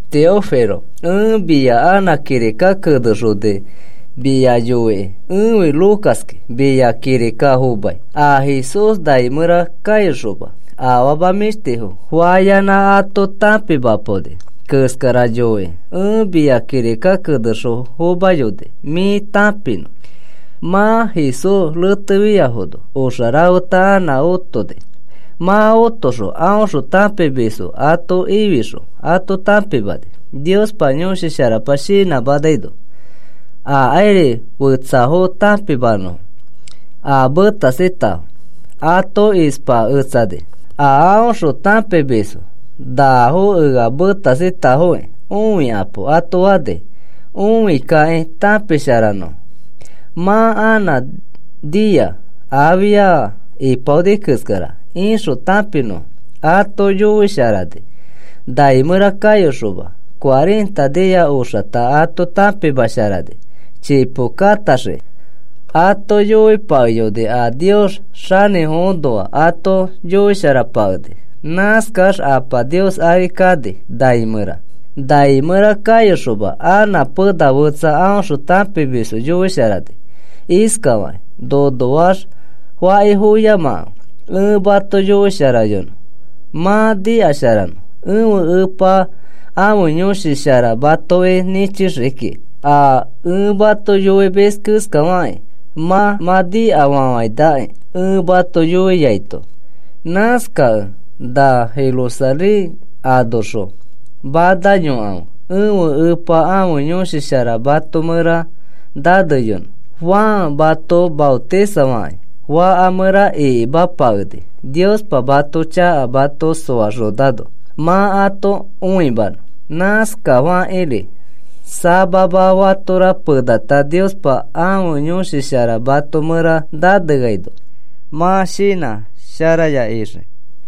Teófilo, ẽ mia anã kirika kenexoni mia yoikĩ. Ẽfi Lucaski, mia kirika fomai. A Jesús nai mẽra kayoxoma afama mĩshtifo fayanã ato tãpimapaoni keskara yoikĩ ẽ mia kirika kenexõ fomayoni, mĩ tãpinõ. Mã Jesús retefiafono oxa rafeta anã otoni. Mã otoxõ aõxõ tãpimisfo ato ifixõ ato tãpimani Niospa Yõshi Sharapa shinãmanaino akairi fetsafo tãpimanõfo. A metasitafo ato ispaketsani a aõxõ tãpimisfo. “Nafo ea metasitafokĩ õikapo,” ato fani õikakĩ tãpisharanõfo. Mã anã nia afia ipaoni keskara ixõ tãpinõfo ato yoisharani nai mẽra kayoxoma. Cuarenta nia oxata ato tãpimasharani chipo katãxiki ato yoipakeyoni a Nios xanĩfoõnoa ato yoisharapakeni. Nãskax Apa Nios ari kani nai mẽra. Nai mẽra kayoxoma anã pena fetsa aõxõ tãpimisfo yoisharani iskafakĩ: “Nonoax fakifoyoyamakãfe. Ẽ mato yoisharayonõ, mã nikasharanõ. Ẽfe Epa ãfe Yõshi Shara matoki nĩchixii kikĩ a ẽ mato yoimis keskafakĩ. Mã mã nikafafainakĩ ẽ mato yoiaito. Nãskakẽ na Jerusalén anoxõ manayokãfe, ẽfe Epa ãfe Yõshi Shara mato mẽra naneyonõ. Juan mato maotisafakĩ faka mẽra ikimapakeni Niospa mãto chaka mato soaxonano mã ato õimanõ. Nãskafakĩri samama fatora penata Niospa ãfe Yõshi Shara mato mẽra naneaino mã shinã sharaya ixii.”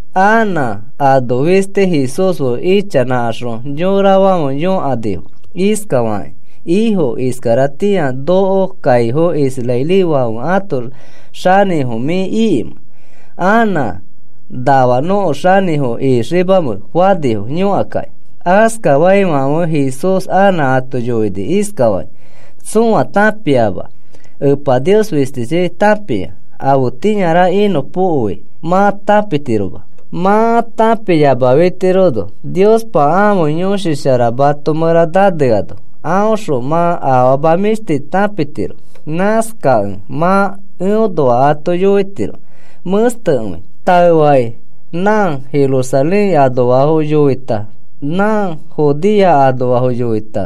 Anã ano fisti Jesús fe ichanãkaxõ yorafãfe yõkanifo iskafakakĩ: “¿Ifo, iskaratĩa nõko kaifo israelifãfe ãto xanĩfo mĩ ikimẽ? ¿Anã nafa nõko xanĩfo ixiimamẽ?” fanifo yõkakakĩ. Askafaifãfe Jesús anã ato yoini iskafakĩ: “Tsõa tãpiama. Epa Nios fistichi tãpia. Afetĩara inõpokoi mã tãpitiroma. Mã tãpiyamafitirono Niospa ãfe Yõshi Shara mato mẽra naneano aõxõ mã afama mĩshti tãpitiro. Nãskakẽ mã eõnoa ato yoitiro mẽstekõi. Taefakĩ nã Jerusalén anoafo yoita, nã Judea anoafo yoita,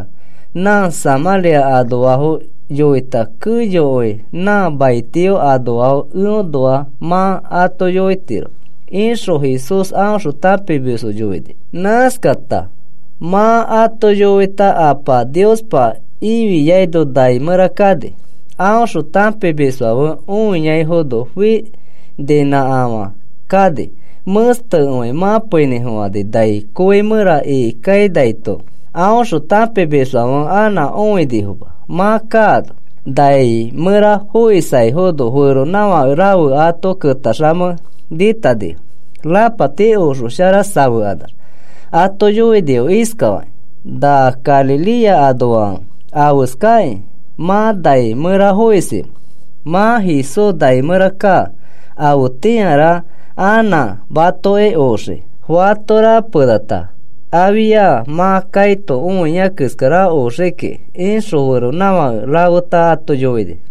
nã Samãria anoafo yoita, keyokõi nã maitio anoafo eõnoa mã ato yoitiro,” ixõ Jesús aõxõ tãpimisfo yoini. Nãskata mã ato yoita Apa Niospa ifiaino nai mẽra kani. Aõxõ tãpimisfãfe õiaifono fininãkafã kani. Mẽstekõi mãpeinĩfofani nai kõi mẽra ikikainaito aõxõ tãpimisfãfe anã õinifoma mã kaano. Nai mẽra foisaifono feronãfake rafe ato ketaxamei nĩtanifo rapati oxo shara safekanax ato yoinifo iskafakĩ: “¿Na Galilea anoafãfe, afeskakĩ mã nai mẽra foisimẽ? Mã Jesús nai mẽra kaa. Afetĩara anã matoki oxii. Fatora penata afia mã kaito õia keskara oxii kiki,” ixõ feronãfake rafeta ato yoini.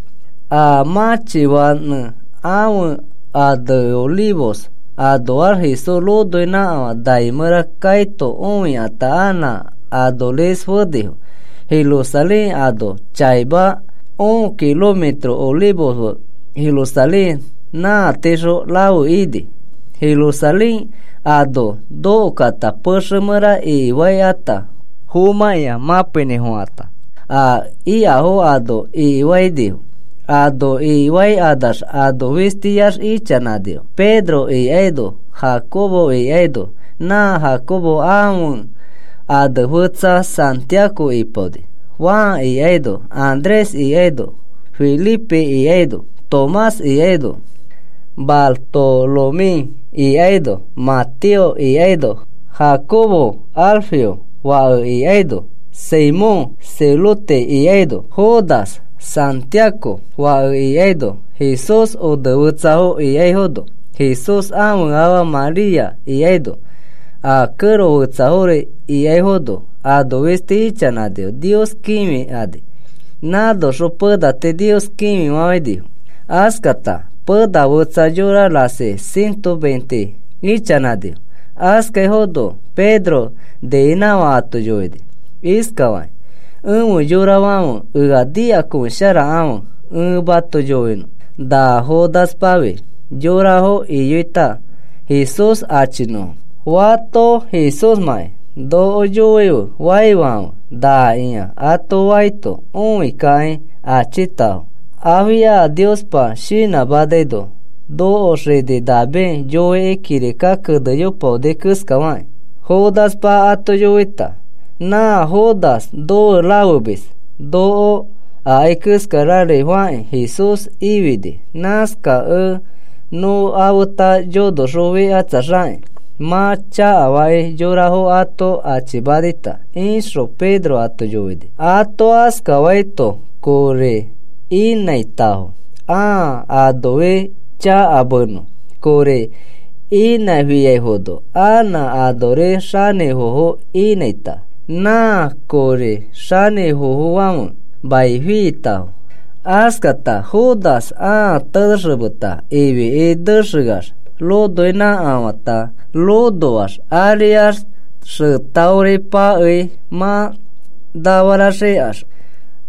A mãchifanẽ ãfe ane Olivos anoax Jesús ronoinãkafã nai mẽra kaito õikata anã anoris fenifo Jerusalén ano chaima. Un kilometro Olivos fe Jerusalén nã tiixõ rafe ini. Jerusalén ano nokokata pexe mẽra ikifaikata fomãkĩa mãpeinĩfofãkata a ikafo ano ikifainifo. Ano ikifaikanax ano fistiax ichanãnifo. Pedro ikaino, Jacobo ikaino (nã Jacobo ãfe ane fetsa Santiago ipaoni), Juan ikaino, Andrés ikaino, Felipe ikaino, Tomás ikaino, Bartolomé ikaino, Mateo ikaino, Jacobo Alfeo fake ikaino, Simón Celote ikaino, Judas Santiago fake ikaino, Jesús onefetsafo ikaifono, Jesús ãfe afa María ikaino, a kẽro fetsafori ikaifono ano fisti ichanãnifo Nios kĩfikani. Nãnoxõ pena tii Nios kĩfifafãinifo. Askata pena fetsa yora rasi ciento veinte ichanãnifo. Askaifono Pedro niinãkafã ato yoini iskafakĩ: “Efe yorafãfe, ea nikakõisharakãfe ẽ mato yoinõ. Na Judaspafi yorafo iyoita Jesús achifonõfo. ‘Fato Jesúsmãkĩ noko yoife,’ faifãfe, ‘Nakĩa,’ ato faito õikakĩ achitafo. Afia Niospa shinãmanaino nõko xini David yoikĩ kirika kenepaoni keskafakĩ Judaspa ato yoita. Na Judas nofe rafemis noko akai keskari fakĩ Jesús ifini. Nãskakẽ nofeta yonoxofikatsaxakĩ mã chakafakĩ yorafo ato achimanita,” ixõ Pedro ato yoini. (Ato askafaito kori inãitafo ãa anofi chakamenõ. Kori inãfiafono anã anoris xanĩfofo inãita. Nã kõri xanĩfofofãfe mai fiitafo. Askata Judas ãa tenexemeta ifiki nexeax ronoinãkafãita. Ronoax ariax xetaori pakei mã nafaraxikax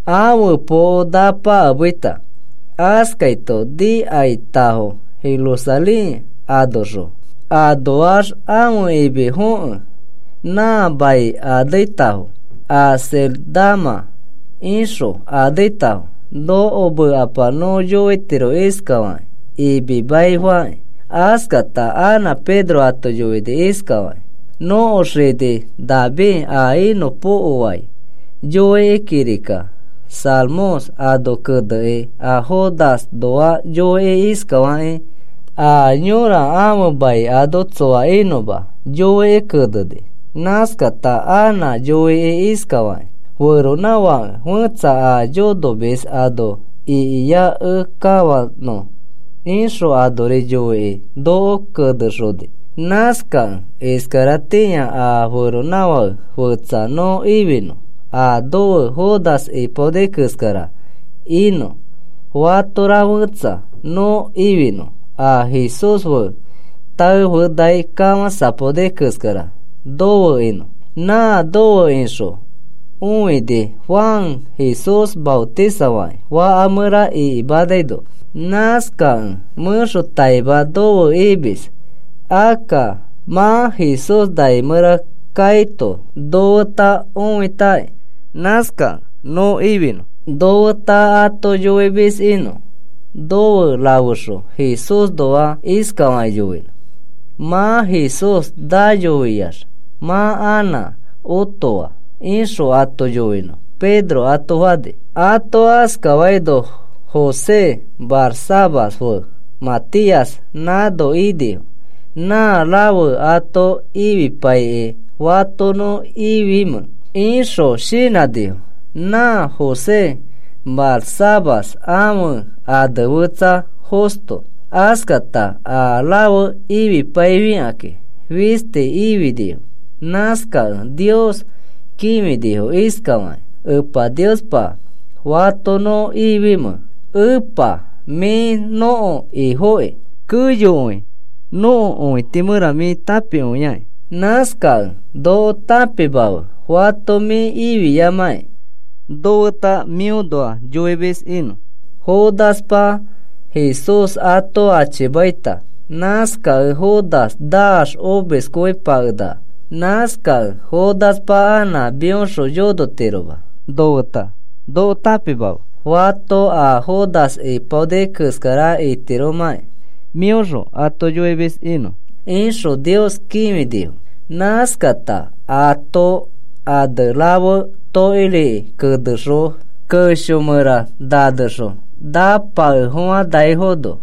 ãfe poko napakemeita. Askaito nikaitafo Jerusalén anoxõ. Anoax ãfe imi fokẽ nã mai aneitafo “Acéldama” ixõ aneitafo. Nõko mekapa nõ yoitiro iskafakĩ: “Imi Mai” fakĩ.) Askata anã Pedro ato yoini iskafakĩ: “Nõko xini David a inõpokoai yoikĩ kirika Salmos ano keneni a Judasnoa yoikĩ iskafakĩ: A yõra ãfe mai ano tsoa inõma, yoikĩ keneni. Nãskata anã yoini iskafakĩ: Feronãfake fetsa a yonomis ano ikiakẽkafanõ, ixõ anori yoikĩ noko kenexoni. “Nãskakẽ iskaratĩa a feronãfake fetsa nõ ifinõ, a nofe Judas ipaoni keskara inõ. Fatora fetsa nõ ifinõ, a Jesús fe taefenai kafãsapaoni keskara nofe inõ. Nã nofe ixõ õini Juan Jesús maotisafakĩ faka mẽra ikimanaino, nãskakẽ mẽxotaima nofe imis, akka mã Jesús nai mẽra kaito nofeta õitakĩ, nãskakẽ nõ ifinõ nofeta ato yoimis inõ. Nofe rafexõ Jesúsnoa iskafakĩ yoinõ: ‘Mã Jesús nayofiax mã anã otofaa,’ ixõ ato yoinõ,” Pedro ato fani. Ato askafaino José Barsabás fe Matías nãno inifo. Nã rafe ato ifipaikĩ, “¿Fato nõ ifimẽ?” ixõ shinãnifo. Nã José Barsabás ãfe ane fetsa Justo. Askata a rafe ifipaifikakĩ fisti ifinifo. Nãskakẽ Nios kĩfinifo iskafakakĩ: “Epa Niospa, ¿fato nõ ifimẽ? Epa, mĩ nõko Ifoki. Keyokõi nõko õiti mẽra mĩ tãpikõiaki. Nãskakẽ noko tãpimafe fato mĩ ifiamãki nofeta mĩõnoa yoimis inõ. Judaspa Jesús ato achimaita. Nãskakẽ Judas naax omiskõipakenaka. Nãskakẽ Judaspa anã mĩõxõ yonotiroma nofeta. Noko tãpimafe fato a Judas ipaoni keskara itiromãkĩ mĩõxõ ato yoimis inõ,” ixõ Nios kĩfinifo. Nãskakata ãto ane rafe tokiriki kenexõ kesho mẽra nanexõ napakefofãnaifono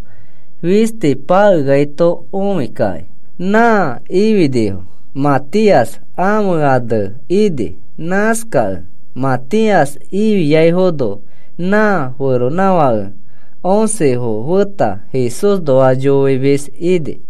fisti pakeaito õikakĩ nã ifinifo. Matías ãfe ane ini. Nãskakẽ Matías ifiafono nã feronãfake oncefo feta Jesúsnoa yoimis ini.